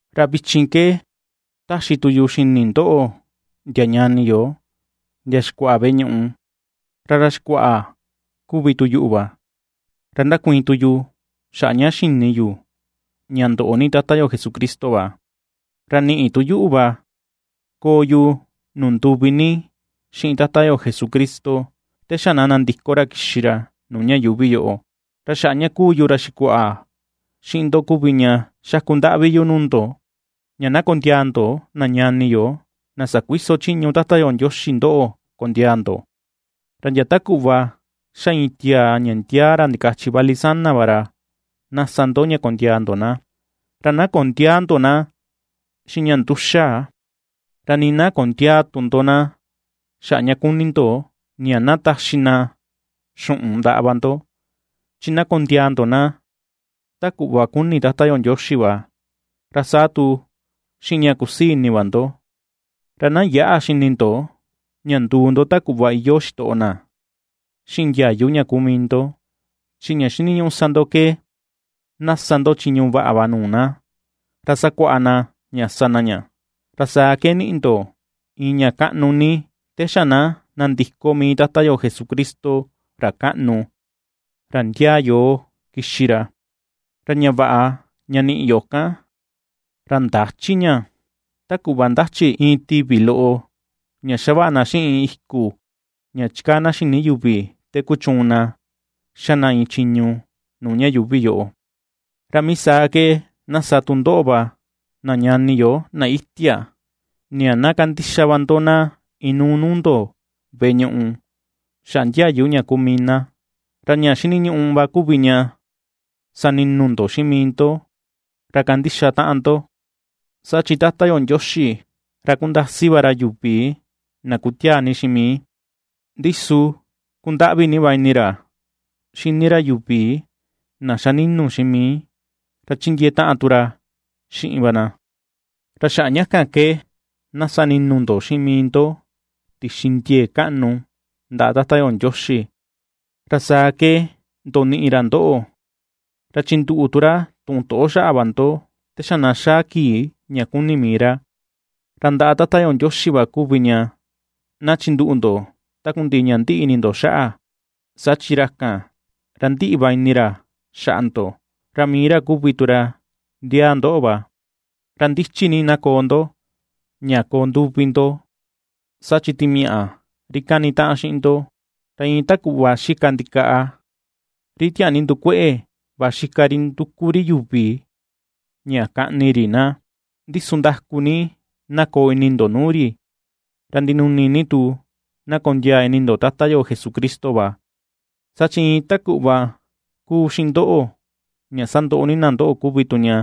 Ra vichin ke taxi tu yu xini ndoꞌo, ndia ñani yo, ndia xikuaꞌa veꞌe ñuꞌu. Ra ra xikuaꞌa kuvi tu yuꞌu va, ra ndakuiin tu yu xaꞌa ña xini yu ña ndoꞌo ni Tata yo Jesucristo va. Ra niꞌi tu yuꞌu va koo yu nuu nduvi ni xiꞌin Tata yo Jesucristo te xa na nandiko ra kixi ra nuu ña yuuvi yoꞌo. Ra xaꞌa ña kuu yu ra xikuaꞌa xiꞌin ndo kuvi ña xaku ndaꞌvi yu nuu ndo, ña na kondiaa ndo na ñani yo na sakuiso chiñu Tata yo Ndioxi ndoꞌo kondiaa ndo; ra ndia ta kuꞌva ^xa iin tiaa ña ndiaa ra ndikachi vali sana va ra na ^sa ndo ña kondiaa ndo na, ra na kondiäa ndo na xiꞌin ña nduxa, ra nii na kondiaa tu ndo na xaꞌa ña kuni ndo ña na taxi na xuꞌun ndaꞌa va ndo. Chi na kondiaa ndo na ta kuꞌva kuni Tata yo Ndioxi va, ra saa tu xiꞌin ña kusii ini va ndo. Ra na yäꞌa xini ndo ña nduu ndo ta kuꞌva iyoo xitoꞌo na xiꞌin ndiayu ña kuu mii ndo, chi ña xiniñuꞌu ^sa ndo ke na ^sa ndo chiñu vaꞌa va nuu na, ra sakuaꞌa na ña sa na ña. Ra saa ke niꞌi ndo iin ña kaꞌnu ni te xa na nandiko mii Tata yo Jesucristo, ra kaꞌnu, ra ndiaa yoo kixi ra. Ra ña vaꞌa ña niꞌi yo kan, ra ndächi ña ta kuꞌva ^ndachi iin tivi loꞌo ña xavaꞌa na xiꞌin iku ña chikaa na xini yuvi te kuchuun na xa na iin chiñu nuu ña yuuvi yoꞌo. Ra mii saa ke na sa tu ndoꞌo va, na ñani yo, na itia, ña na kandixa va ndo na inuu nuu ndo veꞌe ñuꞌu xaꞌa ndiayu ña kuu mii na. Ra ña xiniñuꞌu va kuvi ña sani̱nu̱ ndo xiꞌin mii ndo, ra kandixa taꞌan ndo, saa chi: Tata yo Ndioxi, ra kundasi va ra yuvi na kutiaa ni xiꞌin mii, ndi su kundaꞌvi ni va ini ra xini ra yuvi na xa ninu xiꞌin mii, ra chindiee taꞌan tu ra xiꞌin va na. Ra xaꞌa ña kan ke na sa ni̱nu̱ ndo xiꞌin mii ndo tixi ndiee kaꞌnu ndaꞌa Tata yo Ndioxi, ra saa ke ndoniꞌi ra ndoꞌo, ra chinduꞌu tu ra tuꞌun toꞌo xaꞌa va ndo te xa na xaa kii ña kuni mii ra. Ra ndaꞌa Tata yo Ndioxi va kuvi ña na chinduꞌu ndo takundiꞌi ña ndiꞌi ni ini ndo xaꞌa, saa chi ra kan, ra ndiꞌi va ini ra xaꞌa ndo, ra mii ra kuvi tu ra ndiaa ndoꞌo va. Ra ndichi ni na koo ndo, ña koo nduvi ndo, saa chi timiaꞌa, ri kanitaꞌan xiꞌin ndo, ra iin ta kuꞌva xika ndikaꞌa, ri tiaa ni ndukueꞌe va xika ri nduku ri yuvi ña kaꞌni ri na. Ndi su ndaku ni na koo ini ndo nuu ri, ra ndinuni ni tu na kondiaa ini ndo Tata yo Jesucristo va, saa chi iin ta kuꞌva ^kuu xiꞌin ndoꞌo ña sandoꞌo ni na ndoꞌo kuvi tu ña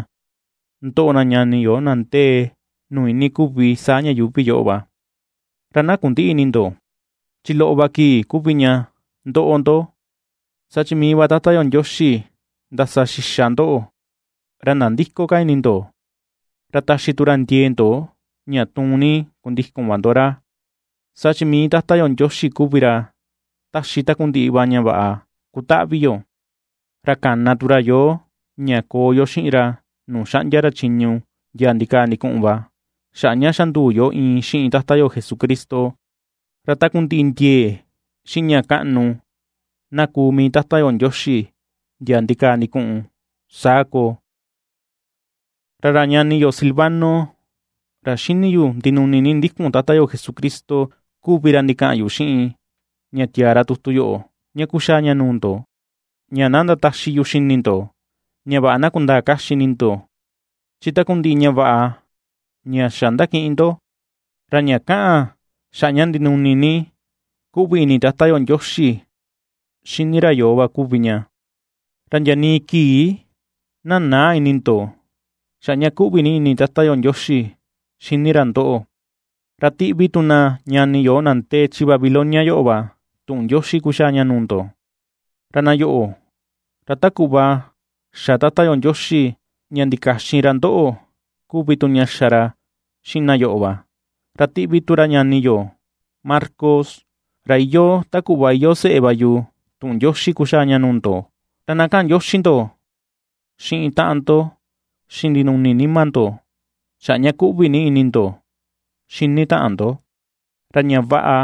^ndoꞌo na ñani yo na ndee nuu iinii kuvi saa ña yuuvi yoꞌo va. Ra na kundïꞌi ini ndo, chi loꞌo ni va kii kuvi ña ndoꞌo ndo, saa chi mii va Tata yo Ndioxi ndasa xixa ndoꞌo, ra nandïko ka ini ndo, ra taxi tu ra ndiee ndo ña tuun ni kundikun va ndo ra. Saa chi mii Tata yo Ndioxi kuvi ra taxi takundiꞌi va ña vaꞌa ^kutaꞌvi yo, ra kana tu ra yoo ña koo yo xiꞌin ra nuu xaꞌndia ra chiñu ndia ndikaa ndikuꞌun va xaꞌa ña xa nduu yo iin xiꞌin Tata yo Jesucristo. Ra takundiꞌi ndiee xiꞌin ña kaꞌnu na kuu mii Tata yo Ndioxi, ndia ndikaa ndikuꞌun. Saa koo. Ra ra ñani yo Silvano, ra xini yu ndinuni ni ndikun Tata yo Jesucristo kuvi ra ndikaꞌan yu xiꞌin, ña tiaa ra tutu yoꞌo, ña kuxaa ña nuu ndo, ña na ndataxi yu xini ndo ña vaꞌa na kundaa kaxi ini ndo chi takundiꞌi ña vaꞌa ña xa ^ndakiꞌin ndo, ra ña kaꞌan xaꞌa ña ndinuni ni kuꞌvi ini Tata yo Ndioxi xini ra yoo va kuvi ña. Ra ndia nii kii na näa ini ndo xaꞌa ña kuꞌvi ni ini Tata yo Ndioxi xini ra ndoꞌo. Ra tiꞌvi tu na ñani yo na ndee chi Babilonia yoꞌo va tuꞌun ndioxi kuxaa ña nuu ndo; ra na yoꞌo, ra ta kuꞌva xa Tata yo Ndioxi ña ndikaxin ra ndoꞌo kuvi tu ña xa ra xiꞌin na yoꞌo va; ra tiꞌvi tu ra ñani yo Marcos, ra iyoo ta kuꞌva iyoo seꞌe va yu tuꞌun ndioxi kuxaa ña nuu ndo. Ra na kaꞌan ndioxi ndo xiꞌin taꞌan ndo, xiꞌin ndinuni nima ndo xaꞌa ña kuꞌvi ni ini ndo xini taꞌan ndo. Ra ña vaꞌa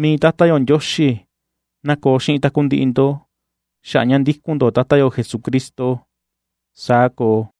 mii Tata yo Ndioxi na koo xiꞌin takundiꞌi ndo xaꞌa ña ndikun ndo Tata yo Jesucristo. Saa koo.